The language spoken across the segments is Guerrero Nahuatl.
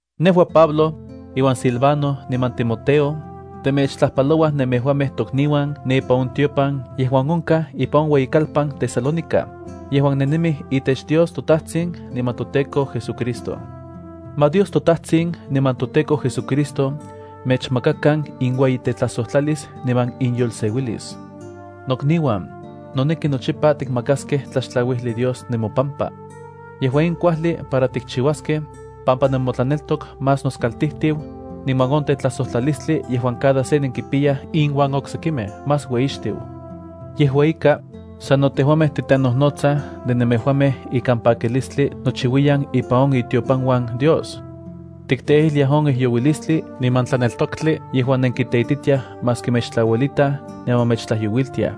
Nejua, Pablo, iuan Silvano niman Timoteo, temechtlajpalouaj nemejuamej tokniuan ne ipan on tiopan yejuan onkaj ipan on ueyikalpan Tesalónica, yejuan nennemij itech Dios toTajtsin niman toTEKO JesuCristo. Ma Dios toTajtsin niman toTEKO JesuCristo mechmakakan inueyitetlajsojtlalis niman iyolseuilis. Nokniuan, noneki nochipa tikmakaskej tlaxtlauijli Dios nemopampa. Yejua in kuajli para tikchiuaskej, pampa nemotlaneltok más noskaltijtiu, niman on tetlajsojtlalistli yejuan cada se nenkipiyaj inuan oksekimej más ueyixtiu. Yejua ika, sano tejuamej titenojnotsaj de nemejuamej ikan pakilistli nochiuiyan ipan on itiopanuan Dios. Tikteijliaj on ijyouilistli niman tlaneltoktli yejuan nenkiteititiaj maski mechtlauelitaj niman mechtlajyouilitiaj.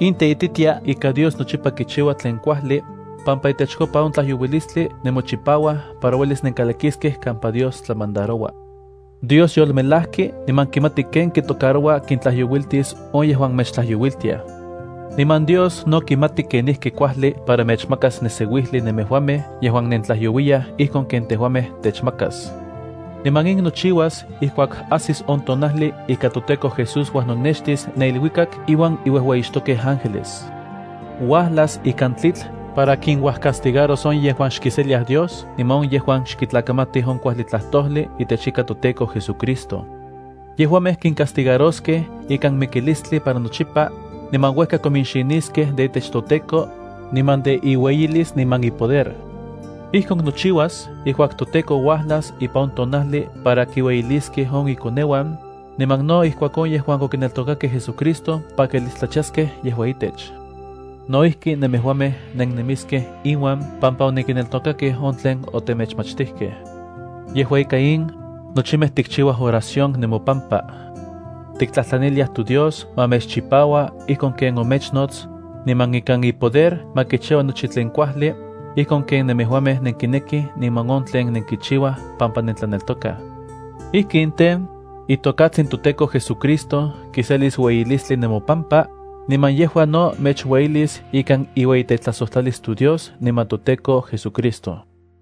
In teititia ika Dios nochipa kichiua tlen kuajli, pampa itechkopa on tlajyouilistli nemochipauaj para uelis nenkalakiskej kampa Dios tlamandaroua. Dios yolmelajki niman kimati kenijki kintlajyouiltis on yejuan mechtlajyouiltiaj. Niman Dios no kimati kenijki kuajli para mechmakas neseuijli nemejuamej yejuan nentlajyouiyaj ijkon ken tejuamej techmakas. Niman in nochiuas ijkuak ajsis on tonajli ika toTEKO Jesús uajnonextis ne iluikak iuan iuejueyixtokej ángeles. Uajlas ikan tlitl para kinuajcastigaros on yejuan xkiseliaj Dios niman on yejuan xkitlakamatij on kuajli tlajtojli itech ika toTEKO JesuCristo. Yejuamej kincastigaroskej ikan mikilistli para nochipa, niman uejka kominxiniskej de itech toTEKO, niman de iueyilis niman ipoder. Ijkon nochiuas ijkuak toTEKO uajlas ipan on tonajli para kiselis ueyilistli de nochimej yejuan yolchipajkej itech Dios. Nemejuamej no nennemiskej inuan pampa onenkineltokakej on tlen otemechmachtijkej. Yejua ika in, nochipa tikchiuaj oración nemopampa. Tiktlajtlaniliaj toDios ma mechchipaua ijkon ken omechnots, niman ikan ipoder ma kichiua nochi tlen kuajli ijkon ken nemejuamej nenkinekij niman on tlen nenkichiuaj pampa nentlaneltokaj. Ijkin tej, itokatsin toTEKO JesuCristo kiselis ueyilistli nemopampa, niman yejua no mechueyilis ikan iueyitetlajsojtlalis toDios niman toTEKO JesuCristo.